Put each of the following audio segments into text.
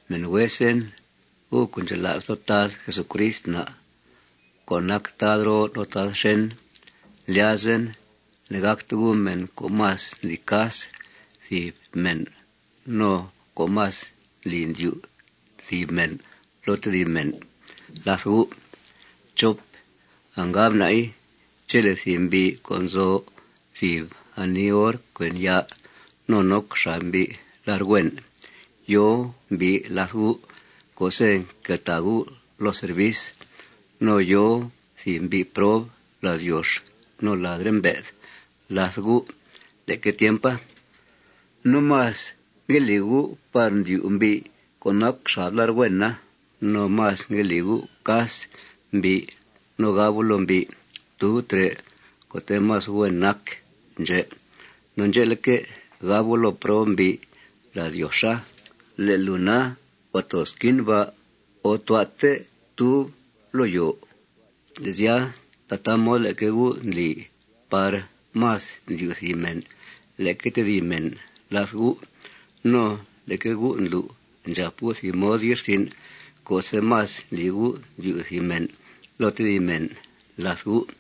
Mèn huesen, gu' co' ndxela's loo Tad Jesucrist na' co' nac Tad roo no Tad xèn, ndlyazen ne'gàcte gu' mèn co' más ndli cas thìb mèn no co' más ndli ndyu' thìb mèn loo tedib mèn làth gu'. Angab na'i, chele' thìb mbi' co' nzo thìb ani or cuen ya' no noc xab mbi' lar' huen, yòo mbi' làth gu' co'se' nqueltàa gu' loo servis, no yòo thìb mbi' prob ladyox no ladre' mbe'th làth gu' leque tiempa, no más ngue li gu' par ndyu' mbi' co' noc xab lar' huena, no más ngue li gu' cas mbi' no gab gu' loo mbi': Ftub trè' co'te' más huen nac ndxè'. No ndxe'leque', gab gu' loo prob mbi' ladyoxa: Le' lùu na, huàa too xquin ba'. O tua'te ftub loo yòo. Le' sya, tataa mod leque gu' ndli par más ndyu' thìb mèn leque tedib mèn làth gu'. No leque gu' ndlu' ndxàp gu' thìb mod ye'rsin' co'se' más ndli gu' ndyu' thìb mèn loo tedib mèn làth gu'.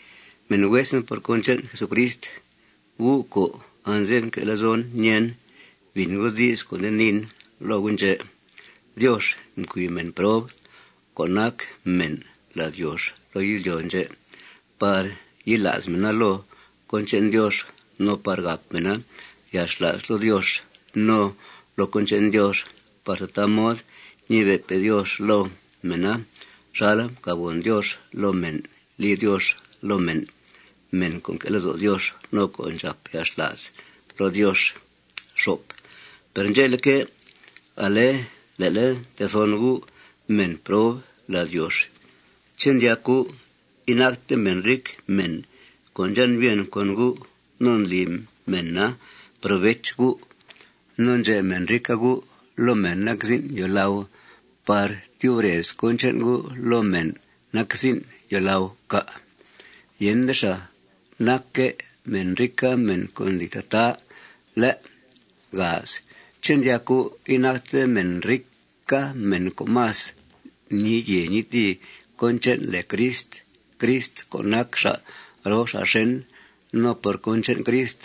Mèn huesen por cón che'n Jesucrist, gu' co' anze'f nque' lezon ñèen, bìn gu' di's co' nde niin loo gu' ndxè': Diox mcui mèn prob co' nac mèn ladyox loo izlyo' ndxè' par yila's mèna loo cón che'n Diox no par gàp mèna yalxla's loo Diox no loo cón che'n Diox par tataa mod ñibe'pe' Diox loo mèna xal mcàbgòn Diox loo mèn li Diox loo men, mèn co' nque' lezo' Diox no co' ndxàp yalxla's loo Diox. Per ndxe'leque', ale le'le' ntethon gu' mèn prob ladyox. ¿Ché' ndyac gu' inacte mèn rica mèn co' ndxan' bien con gu' no ndli mèna provech gu'; no ndxe' mèn rica gu' loo mèn nac zin' yòolau par tyub rez cón che'n gu' loo mèn nac zin' yòolau, cà'? Yende xàa. Nacque' mèn rica mèn co' ndli tataa, ¿lé'? ¿Ché' ndyac gu' inacte mèn rica mèn co' más ñii yèe ñii tìi cón che'n lèe Crist, Crist co' nac xa' roo xa' xèn? No por cón che'n Crist,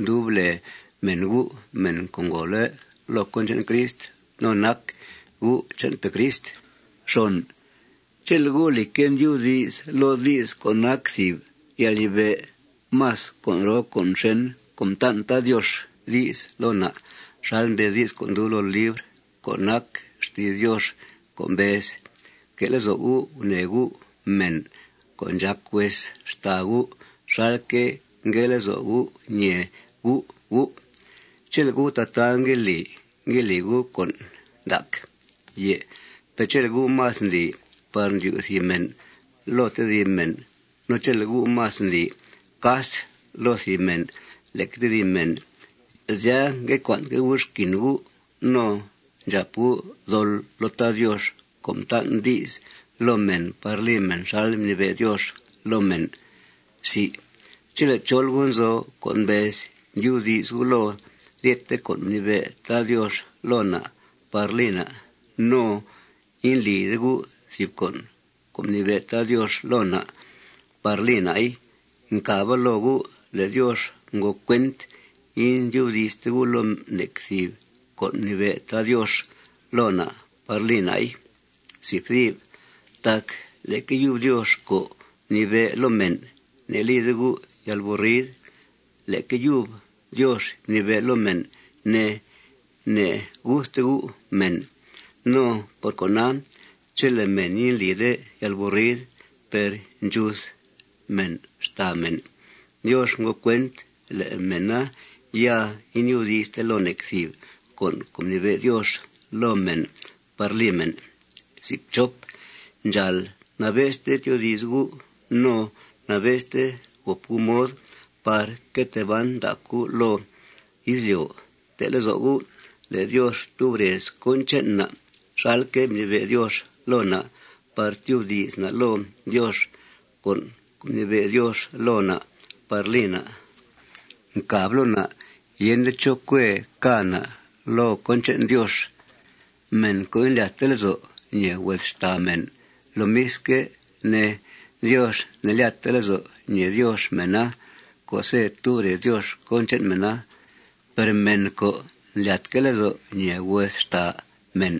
mdub lèe mèn gu' mèn co' ngòole' loo cón che'n Crist no nac gu' che'npe' Crist. Chele' gu', lìcque', ndyubdi's loo di's co' nac thìb yalnibe' más con' roo con' xèn co' mtan' Tad Diox di's loo na' xal mbez di's co' ndub loo libr co' nac xti's Diox co' mbez: Fque' lezo' gu' gunèe gu' mèn co' ndxàc hues xtàa gu' xalque' ngue lezo' gu' ñèe gu' gu'. Chele' gu' tataa ngue li, ngue li gu' con' ndac. Per chele' gu' más ndli par ndyu' thìb mèn loo tedib mèn no chele' gu' más ndli cas loo thìb mèn leque tedib mèn, sya, ngue cua'nque' gu' xquin gu' no ndxàp gu' dol loo Tad Diox co' mtan' di's loo mèn par li mèn xal mnibe' Diox loo mèn. Chele' chol gu' nzo co' mbez ndyubdi's gu' loo ryethe con' mnibe' Tad Diox loo na' par li na' no indlide gu' thìb con' co' mnibe' Tad Diox loo na' par li na'i, ncàba loo gu' le' Diox ngo cuent indyubdi'ste gu' loo nec thìb con' mnibe' Tad Diox loo na' par li na'i. Tac leque yub Diox co' mnibe' loo mèn: Ne'lide gu' yalburrid, leque yub Diox mnibe' loo mèn, ne: Ne'guthte gu' mèn. No por cona, chele' mèn indlide yalburrid per ndxuth mèn xtàa mèn, Diox ngo cuent le' mèna ya indyubdi'ste loo nec thìb con' co' mnibe' Diox loo mèn par li mèn. Ndxàal nabe'ste tyoodi's gu' no nabe'ste gòp gu' mod par que tee ban ndac gu' loo izlyo'. Fte' lezo' gu' le' Diox tub rez cón che'n na' xalque' mnibe' Diox loo na' par tyubdi's na' loo Diox. Con' co' mnibe' Diox loo na' par li na' ncàb loo na' yende chó cuee cà' na' loo cón che'n Diox. Mèn co' indlyatte lezo' ñèe hues xtàa mèn, lomisque' ne, Diox ne'lyatte lezo' ñèe Diox mèna co'se' tub rez Diox cón che'n mèna. Per mèn co' ndlyatque' lezo' ñèe hues xtàa mèn,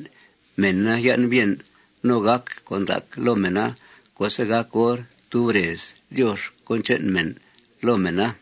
mèna yan' bien no gàc con' ndac loo mèna co'se' gàc hor tub rez Diox cón che'n mèn loo mèna.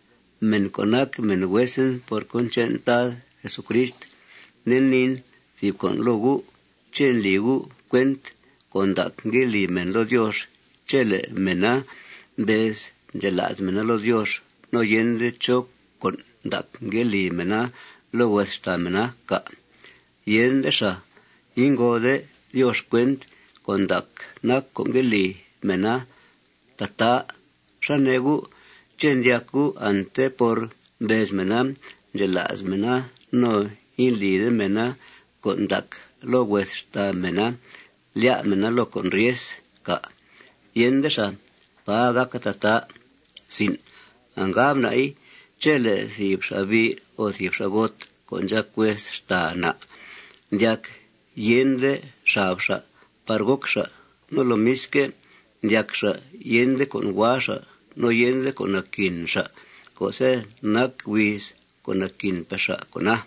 Mèn co' nac mèn huesen por cón che'n Tad Jesucrist, nde niin thìb con' loo gu': ¿Ché' ndli gu' cuent con' ndac ngue li mèn loo Diox chele' mèna mbez ndxela's mèna loo Diox no yende chó con' ndac ngue li mèna loo hues xtàa mèna, cà'? Yende xàa. Ingode Diox cuent con' ndac nac co' ngue li mèna tataa. ¿Xá nee gu'? ¿Ché' ndyac gu' ante por mbez mèna ndxela's mèna no indlide mèna con' ndac loo hues xtàa mèna lyá' mèna loo con' ryes, cà'? Yende xàa. Pà gàca tataa. Angab na'i, chele' thìb xa'bi' o thìb xa'got co' ndxàc hues xtàa na' ndyac yende xab xa' par goc xa', no lomisque', ndyac xa' yende con' hua xa' no yende con' naquin xa' co'se' nac huiz co' naquinpe' xa' con'a,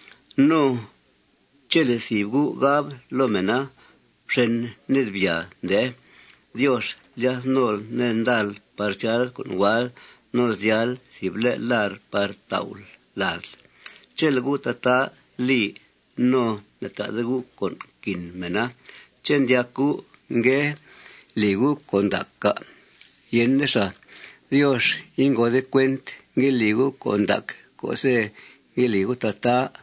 no chele' thìb gu' gab loo mèna: Fxen ned. Byàa, ndee. Diox lyath nol ned ndal par zyal co' hual no zyal thìb le' lar' par tau'l ladl. Chele' gu' tataa li no ne'ta'de gu' con' nquin mèna, ¿ché' ndyac gu' ngue li gu' con' ndac, cà'? Yende xàa. Diox ingode cuent ngue li gu' con' ndac co'se' ngue li gu' tataa.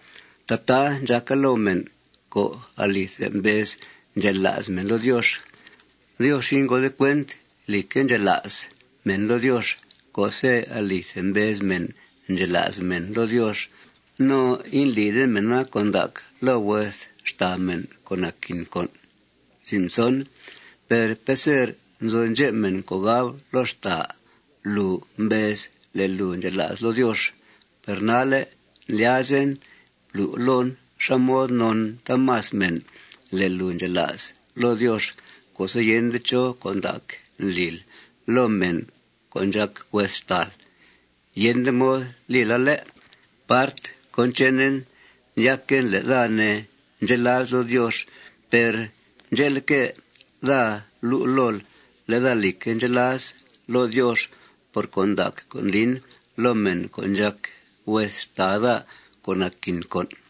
Tataa ndxàca loo mèn co' alithe mbez ndxela's mèna loo Diox. Diox ingode cuent, lìcque', ndxela's mèn loo Diox co'se' alithe mbez mèn ndxela's mèn loo Diox no indlide mèna con' ndac loo hues xtàa mèn co' naquin con'. Per peser nzo ndxep mèn co' gab loo xtàa: Lùu mbez le' lùu ndxela's loo Diox. Per nalle' ndlyazen blu' loon xá mod non taamas mèn le' lùu ndxela's loo Diox co'se' yende chó con' ndac ndlil loo mèn co' ndxàc hues xtàal. Yende mod lila, ¿lé'? Part cón chenen, ndyaquen le' daa, ne, ndxela's loo Diox. Per ndxe'leque', daa lu' lool le' daa, lìcque', ndxela's loo Diox por con' ndac co' ndlin loo mèn co' ndxàc hues xtàa daa co' naquin con'.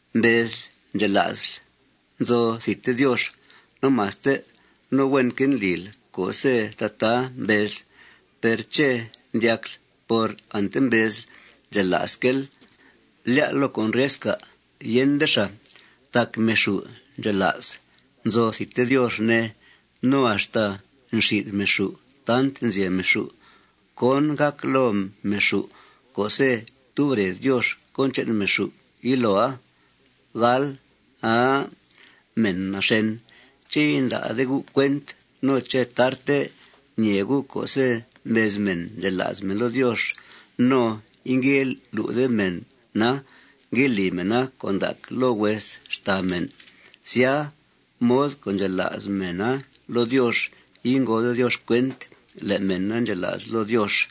Mbezl ndxela'sl nzo thidte Diox no maste. No huenque' ndlil co'se' tataa mbezl. Per ¿ché' ndyacl por ante mbezl ndxela'sque'l, lyá'l loo con' ryes, cà'? Yende xàa. Tac meexù' ndxela's nzo thidte Diox, ne. No axta nxi'th meexù' tant nzyeb meexù' cón gàc loo meexù' co'se' tub rez Diox cón che'n meexù' yiloa. ¡Aa mèn naxèn! ¿Ché' inda'de gu' cuent no ché' tarte ñee gu' co'se' mbez mèn ndxela's mèn loo Diox no ingue lu'de mèna ngue li mèna con' ndac loo hues xtàa mèn, sya, mod co' ndxela's mèna loo Diox ingode Diox cuent le' mèna ndxela's loo Diox?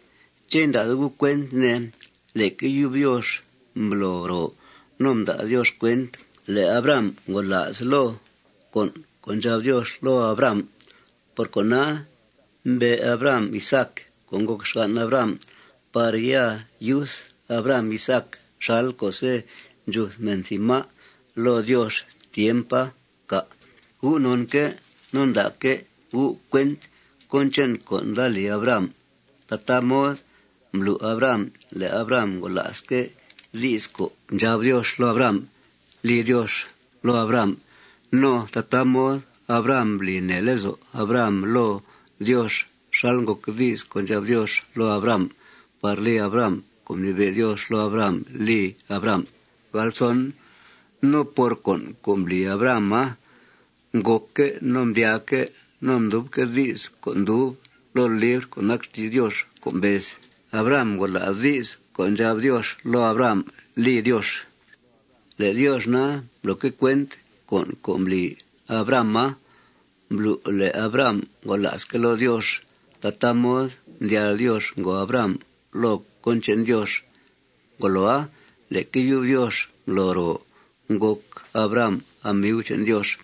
¿Ché' inda'de gu' cuent, ne, leque yub Diox mblo ro no mda' Diox cuent le' Abraham ngola's loo con' co' ndxab Diox loo Abraham? Por cona, mbe' Abraham Isaac co' ngòc xgan' Abraham par ya yuth Abraham Isaac xal co'se' ndxuth mèn thìb má' loo Diox tiempa, cà'? Gu' nonque' no nda'que' gu' cuent cón che'n con' nda li Abraham, tataa mod mblu' Abraham le' Abraham ngola'sque' di's co' ndxab Diox loo Abraham li Diox loo Abraham. No tataa mod Abraham mbli nèe lezo' Abraham loo Diox xal ngòc di's co' ndxab Diox loo Abraham par li Abraham con' mnibe' Diox loo Abraham li Abraham. No por con' co' mbli Abrahama, ngòcque' no mdyaaque' no mdubque' di's co' ndub loo libr co' nac xti's Diox co' mbez: Abraham ngola's di's co' ndxab Diox loo Abraham li Diox. Le' Diox na, mbloque' cuent con' co' mbli Abrahama mblu' le' Abraham ngola'sque' loo Diox. Tataa mod mdyal Diox ngòo Abraham loo cón che'n Diox. Ngoloa, leque yub Diox mblo ro ngòc Abraham amiu che'n Diox.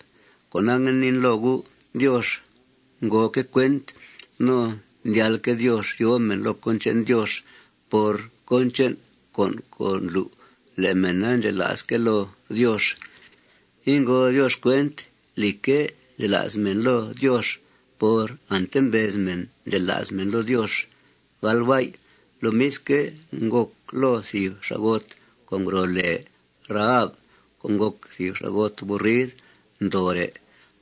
Cona, ngue niin loo gu': Diox ngoque' cuent no ndyalque' Diox yòo mèn loo cón che'n Diox por cón che'n con' co' ndlu' le' mèna ndxela'sque' loo Diox. Ingode Diox cuent, lìcque', ndxela's mèn loo Diox por ante mbez mèn ndxela's mèn loo Diox. Lomisque', ngòc loo thìb xa'got co' ngro' lèe Rahab co' ngòc thìb xa'got burrid ndoore'.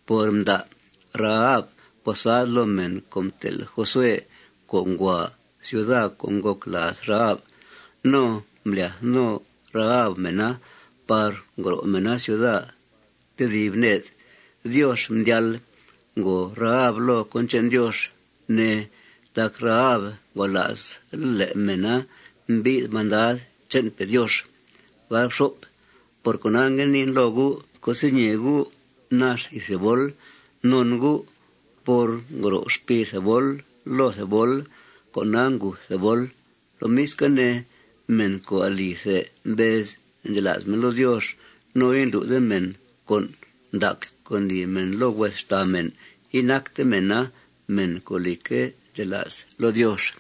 Por mda' Rahab posad loo mèn co' mtel' Josué, co' ngua ciuda co' ngòc làaz Rahab, no mblyath no Rahab mèna par ngro' mèna ciudaa tedib ned, Diox mdyal ngòo Rahab loo cón che'n Diox, ne, tac Rahab ngola's le' mèna mbi'th mandad che'npe' Diox. Por cona, ngue niin loo gu': Co'se' ñèe gu' nax thìb thebol non gu' por ngro xpii thebol loo thebol, con'a nguth thebol. Lomisque' ne, mèn co' alithe mbez ndxela's mèn loo Diox no indlu'de mèn con' ndac co' ndli mèn loo hues xtàa mèn, inacte mèna mèn co', lìcque', ndxela's loo Diox.